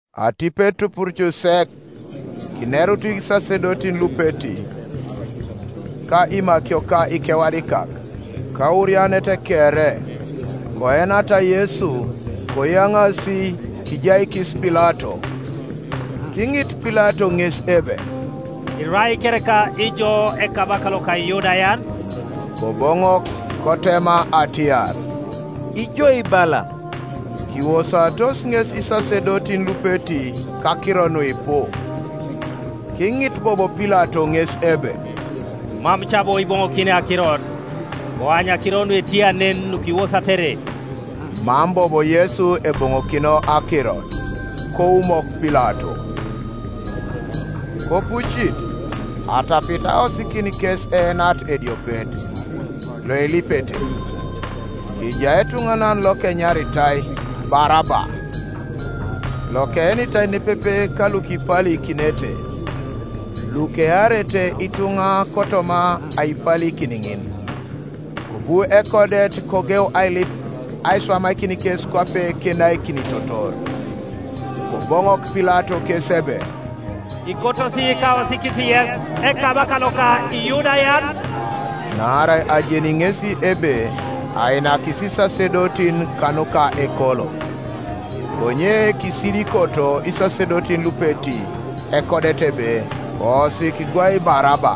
Atipet tupuruc sek kinerut isasedotin lupeti ka imakio ka ikewadikak, ka aurianet kere, koenata Yesu, koyaŋaasi, kijaikis Pilato. Kiŋit Pilato ŋes ebe, “Irai kereka ijo Ekabaka loka Iyudayan?” Koboŋok kotema atiar, “Ijo ibala.” Kiwosatos ŋes isasedotin lupeti kakiro nuipu. Kiŋit bobo Pilato ŋes ebe, “Mam cabo iboŋokini akirot? Koany akiro nuetia nen nukiwosatere,” Mam bobo Yesu eboŋokino akirot; koumok Pilato. Kopucit atapit aosikin kes eenat ediopet, loelipete. Kejai etuŋanan lokenyaritai Baraba, lokeenitai nepepe kalukipaliikinete, lukearete ituŋa kotoma aipaliikin ŋin, Kobu ekodet kogeu ailip aiswamakin kes kwape kenaikinitotor. Koboŋok Pilato kes ebe, “Ikotosi kaosikis yes Ekabaka loka Iyudayan?” Naarai ajeni ŋesi ebe ainakis isasedotin kanuka ekolo. Konye kisidikoto isasedotin lupeti ekodet ebe, koosik gwai Baraba.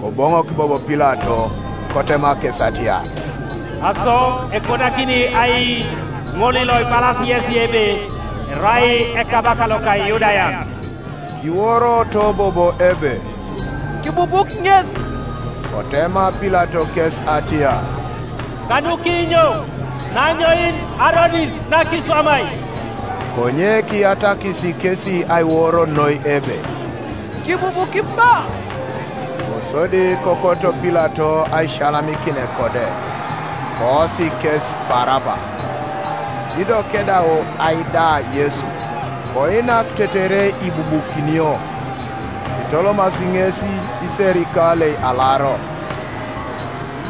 Koboŋok bobo Pilato, kotema kes atiar, “Aso ekonakini ai ŋol loibalasi yesi ebe erai Ekabaka loka Iyudayan?” Kiworoto bobo ebe, “Kibubuk ŋes.” Kotema Pilato kes atiar, “Kanukinyo, naanyoin aronis nakiswamai?” Konye kiyatakisi kesi aiworo noi ebe, “Kibubuk ba.” Kosodi kokoto Pilato aisiyalamikin ekodet, koosik kes Baraba, ido kedau aida Yesu koinak tetere ibubukinio. Kitolomasi ŋes iserikalei alaro,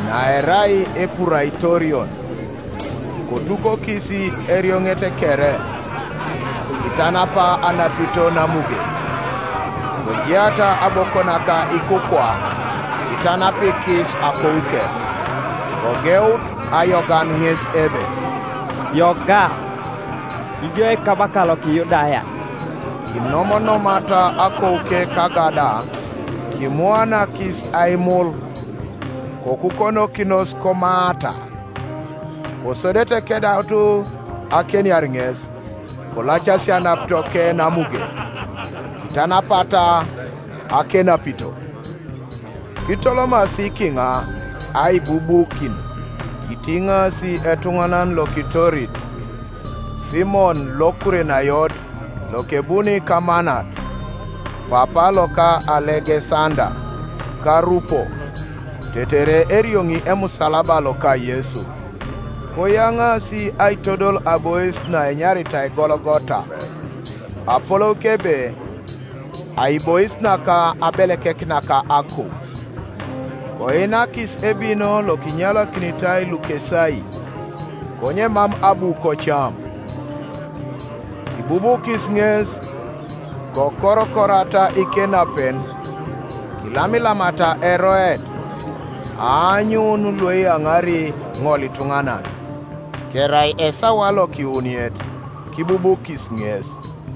naerai Epuraitorion, kotukokis erioŋet kere. Kitanapa anapito namuge, kojeata aboko naka ikukwa, kitanapikis akouke. Kogeut ayogan ŋes ebe, “Yoga, ijo Ekabaka loka Iyudayan!” Kinomonomata akouke kagada, kimwaanakis aimul, kokukonokinos komaata. Kosodete kedaut akienar ŋes, kolacasi anapito namuge, kitanapata akenapito. Kitolomasi kiŋa aibubukin. Kitiŋaasi etuŋanan lokitorit, Simon Lokurenayot lokebuni kamanat, papa loka Alegesanda ka Rupo, tetere erioŋi emusalaba loka Yesu. Koyaŋaasil aitodol aibois naenyaritai Gologota, apolouke ebe, Aibois naka Abelekek naka Akou. Koinakis ebino lokinyalakinitai lukesai; konye mam abu kocam. Kibubukis ŋes, kokorokorata ikenapen, kilamilamata eroet, aanyun lueyaŋaari ŋolituŋanan. Kerai esawa lokiwuniet, kibubukis ŋes.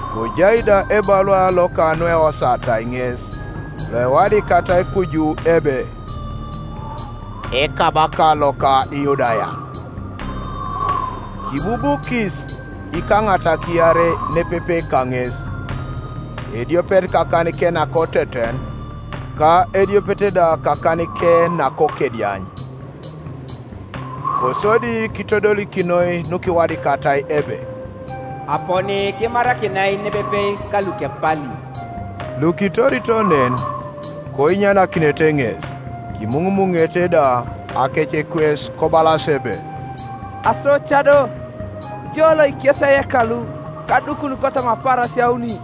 Kojai da ebalua loka nueosatai ŋes loewadikatai kuju ebe, “EKABAKA LOKA IYUDAYAN.” Kibubukis ikaŋatak iarei nepepe kaŋes; ediopet kakanike nakoteten, ka ediopet da kakanike nakokediany. [ Kosodi kitodolikinoi Nukiwadikatai ebe, “Aponi kimarakinai nepepe kalukepali.”] Lukitorito nen koinyanakinete ŋes, kimuŋumuŋete da akecekwes, kobalas ebe, “Aso cado! Ijo loikesi eyekalu, ka adukun kotoma apaarasia auni,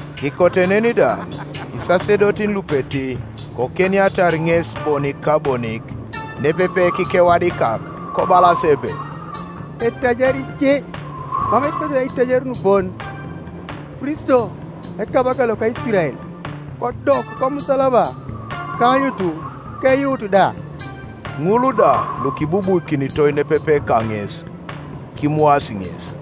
Kikote nen da isasedotin lupeti kokienatar ŋes bonik ka bonik nepepe kikewadikak, kobalas ebe, “Etajar ice; mam epedori aitajarun bon. Kristo, Ekabaka loka Isirael, kodoku komusalaba, kaanyutu, keyuutu da.” Ŋul da lukibubukinitoi nepepe kaŋes kimuasi ŋes.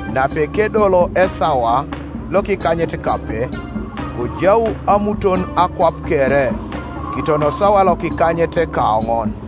Napekedolo esawa lokikanyet kape, kojau amuton akwap kere kiton osawa lokikanyet kaoŋon.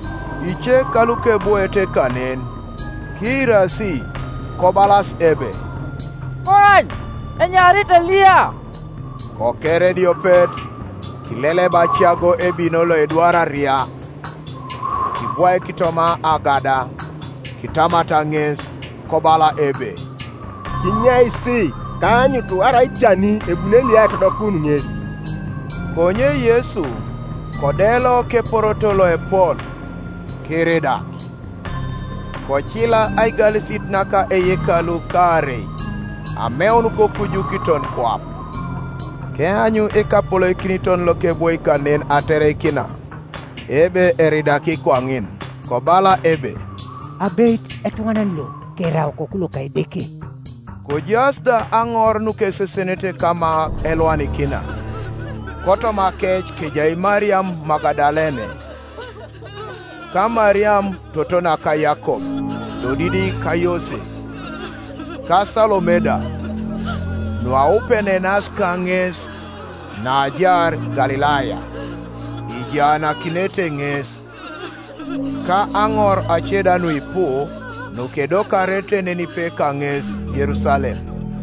Ice kalukebwoete kanen, kiirasi, kobalas ebe, “Koany, enyarit Eliya.” Koker ediopet, kileleb acago ebino loedwar ria, kibwaik toma agada, kitamat ŋes, kobala ebe, “Kinyeisi; kaanyutu arai cani ebuni Eliya aitodokun ŋes.” Konye Yesu kodelo keporoto loepol, kiridak. Kocila aigalisit naka eyekalu kaarei ameun kokuju kiton kwap. Keanyu ekapolokiton lokebwoi kanen atereikina, ebe eridaki kwaŋin, kobala ebe, “Abeit etuŋanan lo kerai Okoku loka Edeke.” Kojaas da aŋor nukesesenete kama elwanikina: kotomakec kejai Mariam Magadalene, ka Mariam toto naka Yakob lodidi ka Yose, ka Salome da, nuaupenenas kaŋes, naajaar Galilaya, ijaanakinete ŋes; ka aŋor ace da nuipu nukedokarete nenipe kaŋes Yerusalem.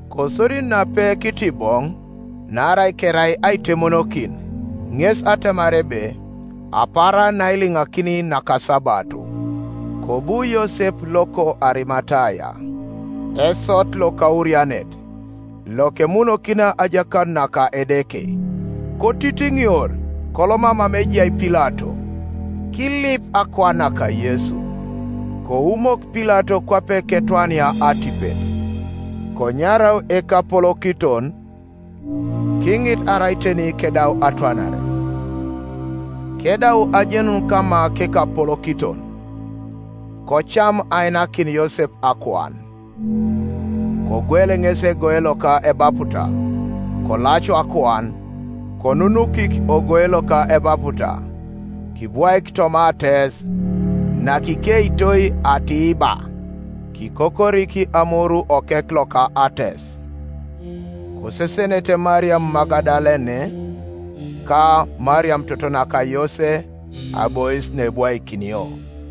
Kosodi napekitiboŋ, naarai kerai Aitemonokin, ŋes atemar ebe apaaran naeliŋakini nakasabato, kobu Yosep loko Arimataya, esot lokaurianet, lokemunokina ajakanut naka Edeke; kotitiŋior koloma mama ejai Pilato, kilip akuan naka Yesu. Koumok Pilato kwape ketwania atipet: konyarau ekapolokiton, kiŋit arai teni kedau atwanare. Kedau ajenun kama kekapolokiton, kocam ainakin Yosep akuan. Kogwel ŋesi egoe loka ebaputa, kolacu akuan, konunukik ogoe loka ebaputa, kibwaik toma ates nakikeitoi atiiba; kikokorik amor okek loka ates. Kosesenete Mariam Magadalene ka Mariam toto naka Yose aibois naebwaikinio.